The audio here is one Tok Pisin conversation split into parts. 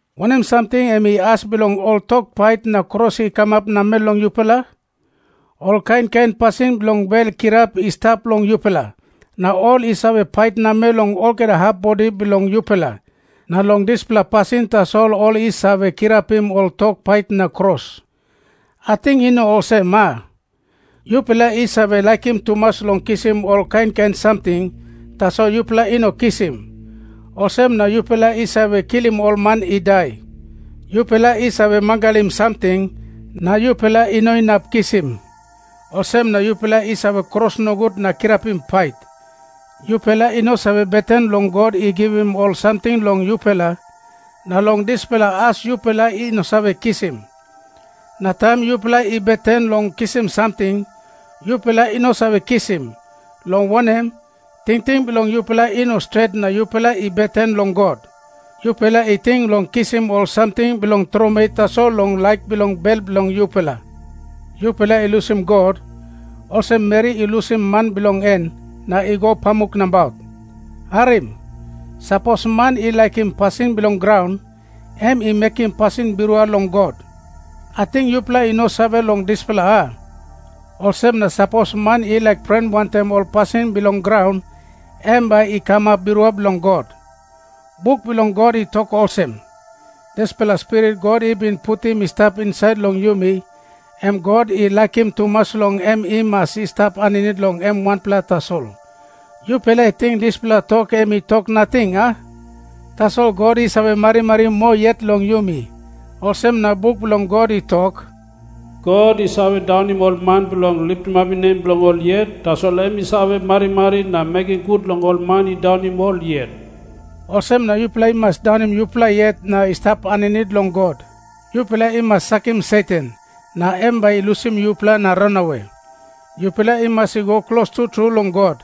Wanem samting em i as bilong ol tok pait na kros i kamap namel long yupela? Ol kain kain pasin bilong bel kirap i stap long yupela, na ol i save pait namel long olgeta hap bodi bilong yupela, na long dispela pasin tasol ol i save kirapim ol tok pait na kros. Ating i no olsem, a? Yupela i save laikim tumas long kisim ol kain kain samting, tasol yupela i no kisim. Olsem na yupela i save kilim ol man i dai. Yupela i save mangalim samting, na yupela i no inap kisim. Olsem na yupela i save kros nogut na kirapim pait. Yupela i no save beten long God i givim ol samting long yupela, na long dispela as yupela i no save kisim. Na taim yupela i beten long kisim samting, yupela i no save kisim, long wanem, tingting bilong yupela i no stret na yupela i beten long God. Yupela i ting long kisim ol samting bilong tromoi tasol long laik bilong bel bilong yupela. Yupela i lusim God, olsem meri i lusim man bilong en na i go pamuk nabaut. Harim. Sapos man i laikim pasin bilong graun, em i mekim pasin birua long God. Ating yupela i no save long dispela, a? Olsem na sapos man i laik pren wantaim ol pasin bilong graun, em bai i kamap birua bilong God. Buk bilong God i tok olsem, "Dispela spirit God i bin putim i stap insait long yumi, em God i laikim tumas long em i mas i stap aninit long em wanpela tasol." Yupela i ting dispela tok em i tok nating, a? Tasol God i save marimari moa yet long yumi. Olsem na buk bilong God i tok, "God i save daunim ol man bilong litimapim nem bilong ol yet, tasol em i save marimari na mekim gut long ol man i daunim ol yet." Olsem na yupela i mas daunim yupela yet na i stap aninit long God. Yupela i mas sakim Satan, na em bai i lusim yupela na ranawe. Yupela i mas i go klostu tru long God,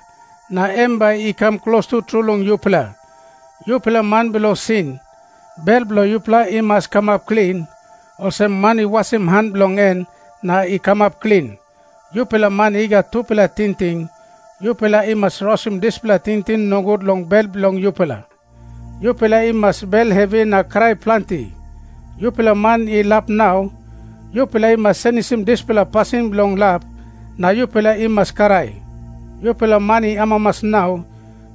na em bai i kam klostu tru long yupela. Yupela man bilong sin, bel bilong yupela i mas kamap klin, olsem man i wasim han bilong en na i kamap klin. Yupela man i gat tupela tingting, yupela i mas rausim dispela tingting nogut long bel bilong yupela. Yupela i mas bel hevi na krai planti. Yupela man i lap nau, yupela i mas senisim dispela pasin bilong lap, na yupela i mas krai. Yupela man i amamas nau,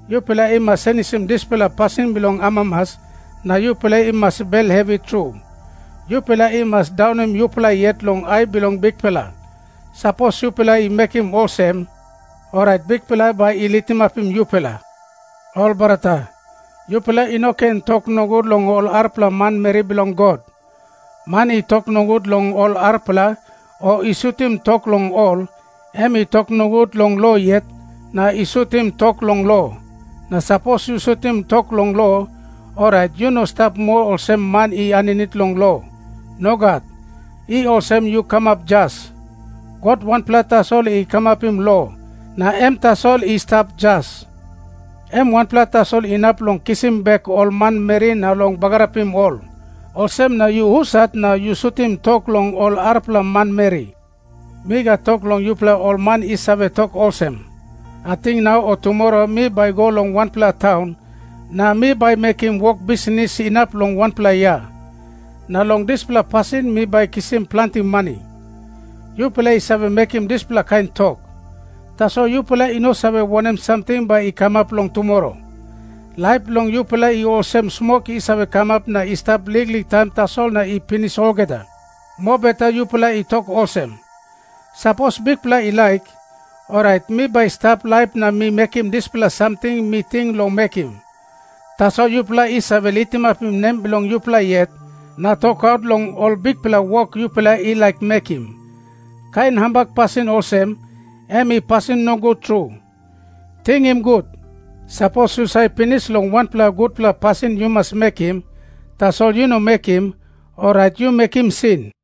yupela i mas senisim dispela pasin bilong amamas, na yupela i mas bel hevi tru. Yupela i mas daunim yupela yet long ai bilong Bikpela. Sapos yupela i mekim olsem, orait Bikpela bai i litimapim yupela. Ol brata, yupela i no ken tok nogut long ol arapela manmeri bilong God. Man i tok nogut long ol arapela o i sutim tok long ol, em i tok nogut long lo yet na i sutim tok long lo. Na sapos yu sutim tok long lo, orait yu no stap moa olsem man i aninit long lo. Nogat. I olsem yu kamap jas. God wanpela tasol i kamapim lo, na em tasol i stap jas. Em wanpela tasol inap long kisim bek ol manmeri na long bagarapim ol. Olsem na yu husat na yu sutim tok long ol arapela manmeri? Mi gat tok long yupela ol man i save tok olsem, "Ating nau o tumora mi bai go long wanpela taun na mi bai mekim wok bisnis inap long wanpela yia. Na long dispela pasin mi bai kisim planti mani." Yupela i save mekim dispela kain tok, tasol yupela i no save wanem samting bai i kamap long tumora. Laip bilong yupela i olsem smok i save kamap na i stap liklik taim tasol na i pinis olgeta. Mobeta yupela i tok olsem, "Sapos Bikpela i laik, orait mi bai stap laip na mi mekim dispela samting mi ting long mekim." Tasol yupela i save litimapim nem bilong yupela yet na tokaut long ol bikpela wok yupela i laik mekim. Kain hambak pasin olsem, em i pasin nogut tru. Tingim gut. Sapos yu save pinis long wanpela gutpela pasin yu mas mekim, tasol yu no mekim, orait yu mekim sin.